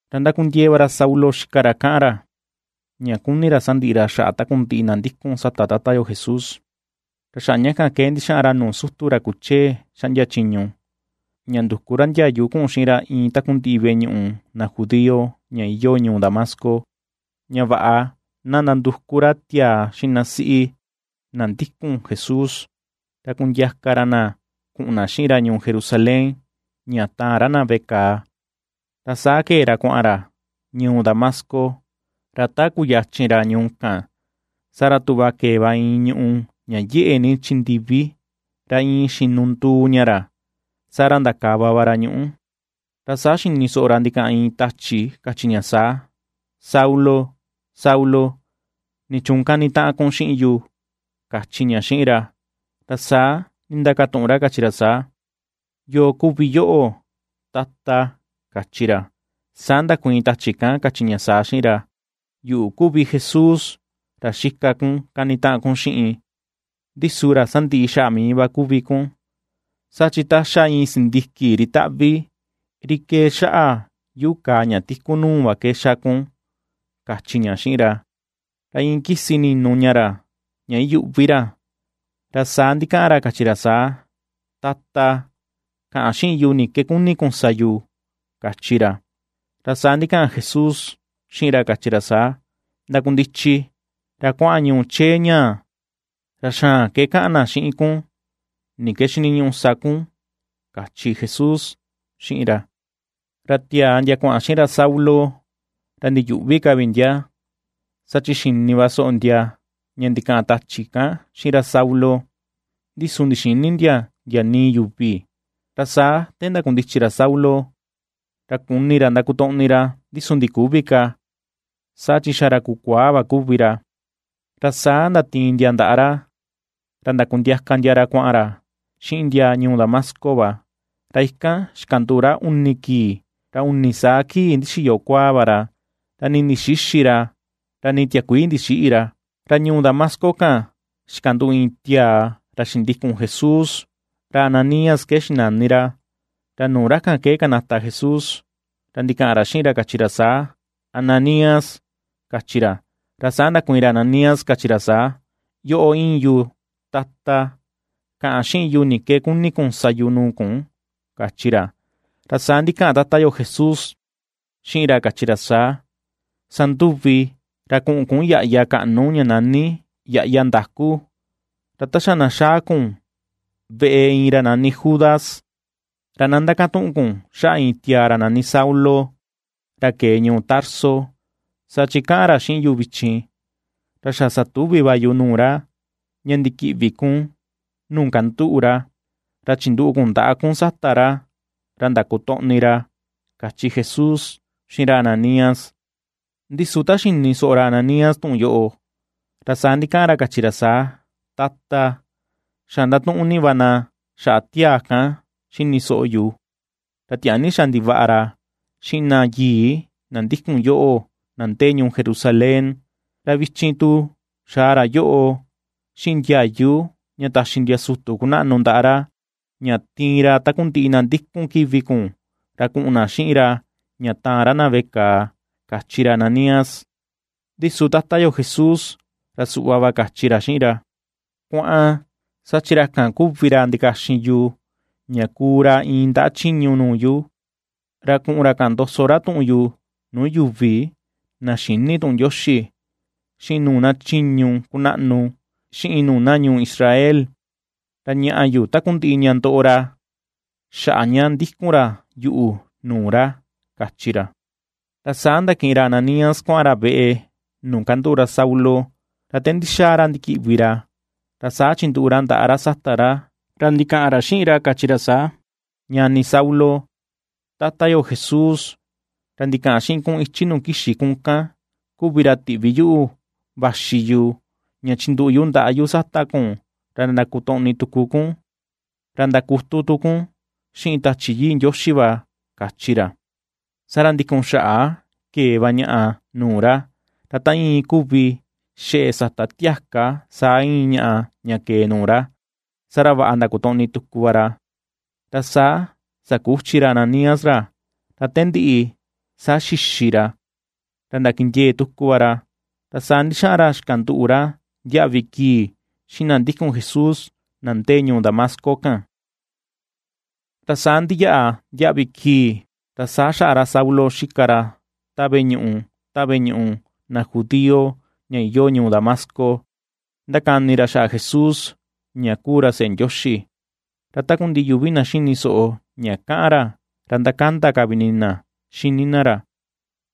Ra ndakundiee va ra Saulo xika ra kaꞌan ra, ña kuni ra sandiꞌi ra xaꞌa takundiꞌi na ndikun sata tata yo Jesús. Ra xaꞌa ña kan ke ndixaꞌan ra nuu sutu, ra kuchee xaꞌndia chiñu, ña nduku ra ndiayu kuꞌun xiꞌin ra iin takundiꞌi veꞌe ñuꞌu na judío ña iyoo ñuu Damasco, ña vaꞌa na nanduku ra tiaa xiꞌin na siꞌi, na ndikun Jesús, ra kundiaka ra na kuꞌun na xiꞌin ra ñuu Jerusalén ña taan ra na veꞌe kàà. Ra saa kee ra kuaꞌan ra ñuu Damasco, ra ta kuyuchin ra ñuu kan, saa ra tuꞌva kee va iin ñùꞌù ña yeꞌe ni chi ndivi, ra iin xinunduu ña ra. Saa ra ndakava ra ñuꞌú va, ra saa xini soꞌo ra ndikaꞌan iin tachi kachi ña saa: ―Saulo, Saulo, ¿nichuun ^kanitaꞌan kun xiꞌin yu? ―kachi ña xiꞌin ra. Ra saa ndindakatuꞌun ra kachi ra saa: ―¿Yoo kuvi yoꞌo, Tata? ―kachi ra. Saa ndakuiin tachi kan kachi ña saa xiꞌin ra: ―Yuꞌu kuvi Jesús ra xika kun ^kanitaꞌan kun xiꞌin. Ndi su ra sandiꞌi xaꞌa mii va kuvi kun, saa chi ta xa iin sindiki ri taꞌvi, ri kee xaꞌa yuꞌu kàà ña tiku nuu va ke ^xa kun ―kachi ña xiꞌin ra. Ra iin kisi ninu ña ra ña iyuꞌvi ra, ra saa ndikaꞌan ra kachi ra saa: ―Tata, kaꞌan xiꞌin yu ni ke kuni kun sa yu ―kachi ra. Ra saa ndikaꞌan Jesús xiꞌin ra kachi ra saa: ―Ndakundichi ra kuaꞌan ñuu chee ñaa, ra xaan ke kaꞌan na xiꞌin kun ni ke xiniñuꞌu sa kun ―kachi Jesús xiꞌin ra. Ra tiaa ndia kuaꞌan xiꞌin ra Saulo, ra ndiyuꞌvi ka vi ndia, saa chi xini va soꞌo ndia ña ndikaꞌan tachi kan xiꞌin ra Saulo, ndi su ndixïni ndia ndia nii yuvi. Ra saa te ndakundichi ra Saulo, ra kuni ndakotoꞌni ra ndi su ndiküvi ka saa chi xa ra kukuaa va kuvi ra. Ra saa ndatiin ndia ndaꞌa ra, ra ndakundiaka ndia ra kuaꞌan ra xiꞌin ndia ñuu Damasco va. Ra ikan xikanduꞌu ra uni kii, ra uni saa kii ndixiyo kuaa va ra, ra nii ndixïxi ra, ra nii tiakuii ndixïꞌi ra. Ra ñuu Damasco kan xikanduꞌu iin tiaa ra xindikun Jesús, ra Ananías ke xinani ra. Ra nuu ra kan ke kanata Jesús, ra ndikaꞌan ra xiꞌin ra kachi ra saa: ―¡Ananías! ―kachi ra. Ra saa ndakuiin ra Ananías kachi ra saa: ―Yoꞌo íin yu, Tata. Kaꞌan xiꞌin yu ni ke kuni kun sa yu nuu kun ―kachi ra. Ra saa ndikaꞌan Tata yo Jesús xiꞌin ra kachi ra saa: ―Sanduvi ra kuꞌun kun yaꞌya kaꞌnu ña nani Yaꞌya Ndakú, ra ta xa na xaa kun veꞌe iin ra nani Judas, ra na ndakatuꞌun kun xaꞌa iin tiaa ra nani Saulo ra kee ñuu Tarso. Saa chi kaꞌan ra xiꞌin yu vichin. Ra xa satuvi va yu nuu ra, ña ndikiꞌvi kun nuu kanduꞌu ra, ra chinduꞌu kun ndaꞌa kun sata ra, ra ndakotoꞌni ra ―kachi Jesús xiꞌin ra Ananías. Ndi su ta xini soꞌo ra Ananías tuꞌun yoꞌo, ra saa ndikaꞌan ra kachi ra saa: ―Tata, xa ndatuꞌun ni va na xaꞌa tiaa kan xini soꞌo yu, ra tiaa ni xa ndivaꞌa ra xiꞌin na yii na ndikun yoꞌo, na ndee ñuu Jerusalén. Ra vichin tu, xaa ra yoꞌo xiꞌin ndiayu ña taxi ndia sutu kunaꞌnu ndaꞌa ra, ña tiin ra takundiꞌi na ndikun kivi kun ra kuꞌun na xiꞌin ra ña taan ra na veꞌe kàà ―kachi ra Ananías. Ndi su tata yo Jesús ra suꞌva va kachi ra xiꞌin ra: ―Kuaꞌan, saa chi ra kan kuvi ra ndikaxin yu ña kuu ra iin ndaꞌa chiñu nuu yu, ra kuꞌun ra kaꞌan ndoso tuꞌun yu nuu yuvi na xïni tuꞌun Ndioxi, xiꞌin nuu na chiñu kunaꞌnu, xiꞌin nuu na ñuu Israel. Ra ñaꞌa yu takundiꞌi ña ndoꞌo ra xaꞌa ña ndikun ra yuꞌu nuu ra ―kachi ra. Ra saa ndakiꞌin ra Ananías kuaꞌan ra veꞌe nuu kanduꞌu ra Saulo, ra te ndixaa ra ndikiꞌvi ra ra saa chinduꞌu ra ndaꞌa sata ra, ra ndikaꞌan ra xiꞌin ra kachi ra saa: ―Ñani Saulo, Tata yo Jesús, ra ndikaꞌan xiꞌin kun ichi nuu kixi kun kan kuvi ra, tiꞌvi yuꞌu vaxi yu ña chinduꞌu yu ndaꞌa yu sata kun ra ndakotoꞌni tuku kun, ra ndakutu tu kun xiꞌin Tachi Yii Ndioxi va ―kachi ra. Saa ra ndikun xaꞌa kee va ñaꞌa nuu ra, ra ta iin kuvi xeꞌe sata tiaka saa íin ñaꞌa ña kee nuu ra, saa ra vaꞌa ndakotoꞌni tuku va ra. Ra saa sakuchi ra Ananías ra. Ra te ndiꞌi saa xixi ra, ra ndakindiee tuku va ra. Ra saa ndixaꞌan ra xikanduꞌu ra ndiaꞌvi kii xiꞌin na ndikun Jesús na ndee ñuu Damasco kan. Ra saa ndiyaꞌa ndiaꞌvi kii ra saa xaꞌa ra Saulo xika ra ta veꞌe ñuꞌu, ta veꞌe ñuꞌu na judío ña iyoo ñuu Damasco ndakani ra xaꞌa Jesús ña kuu ra seꞌe Ndioxi Ra takundiꞌi yuvi na ^xini soꞌo ña kaꞌan ra ra ^ndakanda ka vi ini na xini na ra,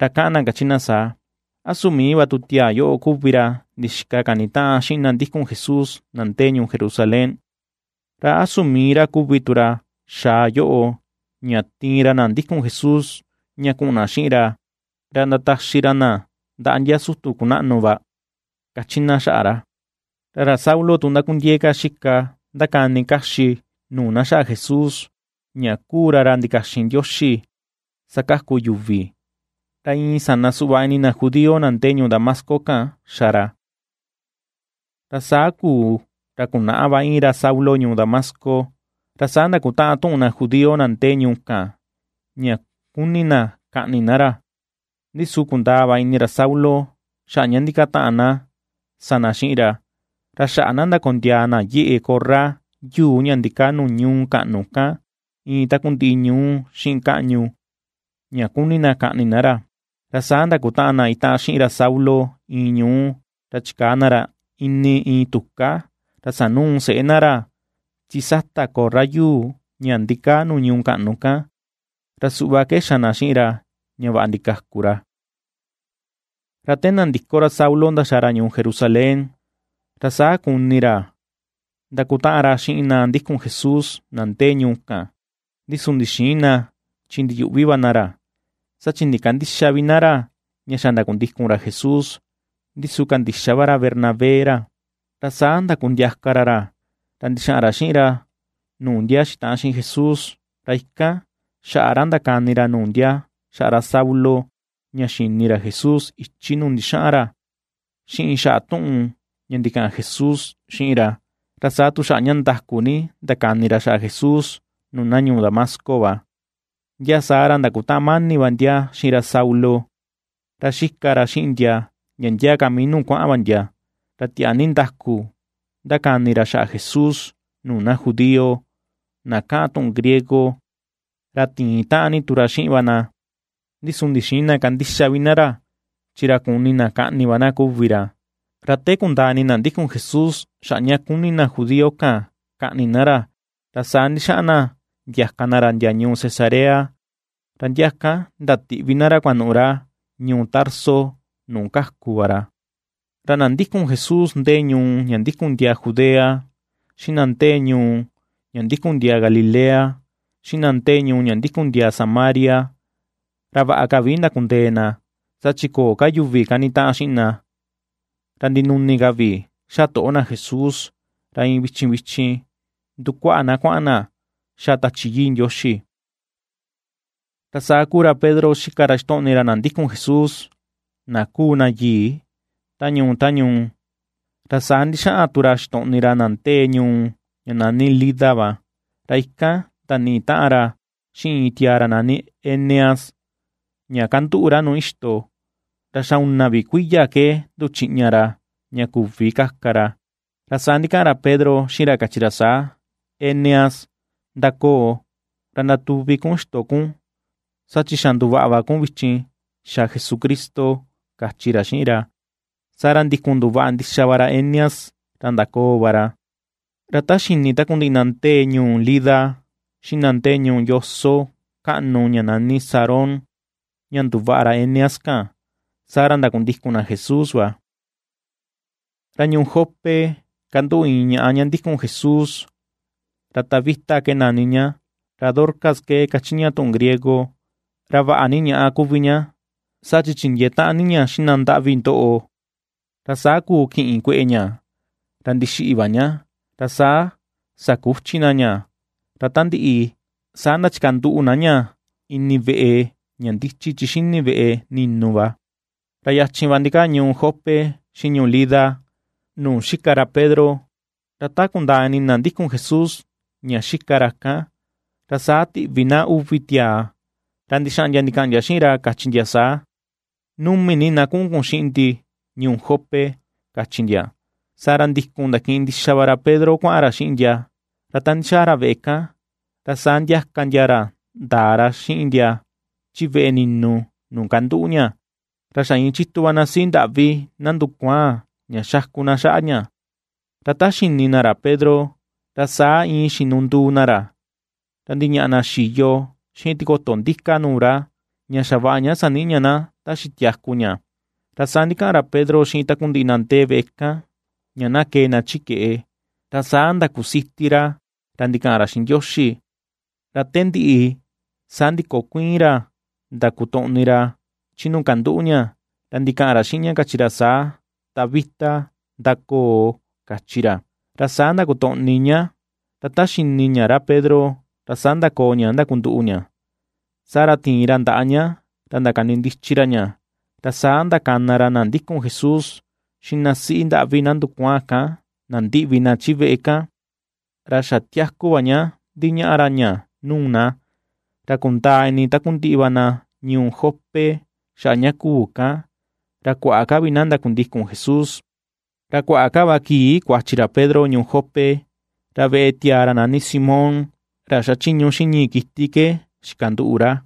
ra kaꞌan na kachi na saa: ―¿A su mii va tu tiaa yoꞌo kuvi ra ndixika kanitaꞌan xiꞌin na ndikun Jesús na ndee ñuu Jerusalén? ¿Ra a su mii ra kuvi tu ra xaa yoꞌo ña tiin ra na ndikun Jesús ña kuꞌun na xiꞌin ra ra ndataxi ra na ndaꞌa ndia sutu kunaꞌnu va? ―^kachi na xaꞌa ra. Ra ra Saulo tu ndakundiee ka xika ndakani kaxi nuu na xaꞌa Jesús, ña kuu ra ra ndikaxin Ndioxi sakaku yuvi; ra iin sana suꞌva ini na judío na ndee ñuu Damasco kan xa ra. Ra saa kuu ra kunaꞌa va iin ra Saulo ñuu Damasco, ra saa ndakutaꞌan tuꞌun na judío na ndee ñuu kan ña ^kuni na kaꞌni na ra. Ndi su kundaa va ini ra Saulo xaꞌa ña ndikataꞌan na sa na xiꞌin ra. Ra xaꞌa na ndakondiaa na yeꞌe korra yuu ña ndikaa nuu ñuu kaꞌnu kan iin takundiꞌi ñuú xiꞌin kaꞌñu, ña kuni na kaꞌni na ra. Ra saa ndakutaꞌan na itaꞌan xiꞌin ra Saulo iin ñuu, ra chikaa na ra ini iin tuká ra sanuu seꞌé na ra chi sata korra yuu ña ndikaa nuu ñuu kaꞌnu kan, ra suꞌva ke xa na xiꞌin ra ña vaꞌa ndikaku ra. Ra te nandiko ra Saulo ndaxaa ra ñuu Jerusalén, ra saa kuni ra ndakutaꞌan ra xiꞌin na ndikun Jesús na ndee ñuu kan, ndi su ndixïin na chi ndiyuꞌvi va na ra, saa chi ndikandïxa vi na ra ña xa ndakundikun ra Jesús. Ndi su kandixa va ra Bernabé ra, ra saa ndakundiaka ra ra, ra ndixaꞌan ra xiꞌin ra nuu ndia xitaꞌan xiꞌin Jesús. Ra ikan xaꞌa ra ndakani ra nuu ndia xaꞌa ra Saulo ña xini ra Jesús ichi nuu ndixaꞌan ra, xiꞌin xaꞌa tuꞌun ña ndikaꞌan Jesús xiꞌin ra, ra saa tu xaꞌa ña ndaku ni ndakani ra xaꞌa Jesús nuu na ñuu Damasco va. Ndia saa ra ndakutaꞌan mani va ndia xiꞌin ra Saulo, ra xika ra xiꞌin ndia, ndia ndia ka mii nuu kuaꞌan va ndia. Ra tiaa ni ndaku ^ndakani ra xaꞌa Jesús nuu na judío na kaꞌan tuꞌun griego, ra tiin taꞌan ni tu ra xiꞌin va na, ndi su ndixïin na kandixa vi na ra chi ra kuni na kaꞌni va na kuvi ra Ra te kundaa ini na ndikun Jesús xaꞌa ña kuni na judío kan kaꞌni ra, ra saa ndixaꞌan na ndiaka na ra ndia ñuu Cesarea, ra ndia ikan ndatiꞌvi na ra kuanuꞌu ra ñuu Tarso nuu kaku va ra. Ra na ndikun Jesús ndee ñuu ña ndikun ndiaa Judea, xiꞌin na ndee ñuu ña ndikun ndiaa Galilea, xiꞌin na ndee ñuu ña ndikun ndiaa Samaria, ra vaꞌa ka vi ndakundee na, saa chi köo ka yuvi kanitaꞌan xiꞌin na, ra ndinuni ka vi ^xa toꞌo na Jesús, ra iin vichin vichin ^ndukuaꞌa na kuaꞌan na ^xa Tachi Yii Ndioxi. Ra saa kuu ra Pedro xika ra xitoꞌni ra na ndikun Jesús, na kuu na yii, ta ñuu ta ñuu, ra saa ndixaꞌan tu ra xitoꞌni ra na ndee ñuu ña nani Lida va. Ra ikan ndaniꞌi taꞌan ra xiꞌin iin tiaa ra nani Eneas, ña kanduꞌu ra nuu ixto, ra xa una vi kuiya ke nduchiꞌña ra ña küvi kaka ra. Ra saa ndikaꞌan ra Pedro xiꞌin ra kachi ra saa: ―Eneas, ndakoo ra ndatuvi kun ixto kun saa chi xa ^nduvaꞌa va kun vichin xa Jesucristo ―kachi ra xiꞌin ra. Saa ra ndikun nduvaꞌa ndixa va ra Eneas ra ndakoo va ra. Ra ta xini takundiꞌi na ndee ñuu Lida xiꞌin na ndee nuu yoso kaꞌnu ña nani Sarón ña nduvaꞌa ra Eneas kan, saa ra ndakundikun na Jesús va. Ra ñuu Jope kanduꞌu iin ñaꞌa ña ndikun Jesús, ra Tabita ke nani ña, ra Dorcas ke kachi ña tuꞌun griego. Ra vaꞌa ni ñaꞌa kuvi ña, saa chi chindiee taꞌan ni ña xiꞌin na ndaꞌvi ndoꞌo. Ra saa kuu kiꞌin kueꞌe ña ra ndixiꞌi va ña. Ra saa sakuchi na ña, ra ta ndiꞌi, saa ndachikanduꞌu na ña ini veꞌe ña ndichi chi xini veꞌe ni̱nù va. Ra yachin va ndikaa ñuu Jope xiꞌin ñuu Lida, nuu xika Pedro, ra ta kundaa ini na ndikun Jesús ña xika ra kan, ra saa tiꞌvi na uvi tiaa ra ndixaꞌan ndia ndikaꞌan ndia xiꞌin ra, kachi ndia saa: ―Numi ni na kuꞌun kun xiꞌin ndi ñuu Jope ―kachi ndia. Saa ra ndikun ndakiꞌin ndixa va ra Pedro kuaꞌan ra xiꞌin ndia. Ra te ndixaa ra veꞌe kan ra saa ndiaka ndia ra ndaa ra xiꞌin ndia chi veꞌe ni̱nù nuu kanduꞌu ña, ra xa iin chitu va na siꞌi ndaꞌvi na ndukuaan ña xaku na xaꞌa ña, ra ta xini na ra Pedro ra saa iin xinunduu na ra, ra ndiñaꞌa na xiyo xiꞌin tikoto ndika nuu ra, ña xavaꞌa ña saniꞌi ña na ta xitiaku ña. Ra saa ndikaꞌan ra Pedro xiꞌin takundiꞌi na ndee veꞌe kan ña na kee na chi keꞌe, ra saa ndakusiti ra ra ndikaꞌan ra xiꞌin Ndioxi, ra te ndiꞌi saa ndikokuiin ra ndakutoꞌni ra chi nuu kanduꞌu ña, ra ndikaꞌan ra xiꞌin ña kachi ra saa: ―Tabita, ndakoo ―kachi ra. Ra saa ndakotoꞌni ña, ra ta xini ña ra Pedro, ra saa ndakoo ña ndakunduꞌu ña. Saa ra tiin ra ndaꞌa ña ra ndakanindichi ra ña; ra saa ndakana ra na ndikun Jesús, xiꞌin na siꞌi ndaꞌvi na ndukuaan kan nandiꞌvi na veꞌe kan, ra xa tiaku va ña ndiñaꞌa ra ña nuu na. Ra kundaa ini takundiꞌi va na ñuu Jope xaꞌa ña kuu kan, ra kuaꞌa ka vi na ndakundikun Jesús. Ra kuaꞌa ka va kii kuachi ra Pedro ñuu Jope, ra veꞌe tiaa ra nani Simón, ra xachiñu xiꞌin ñii kiti ke xikanduꞌu ra.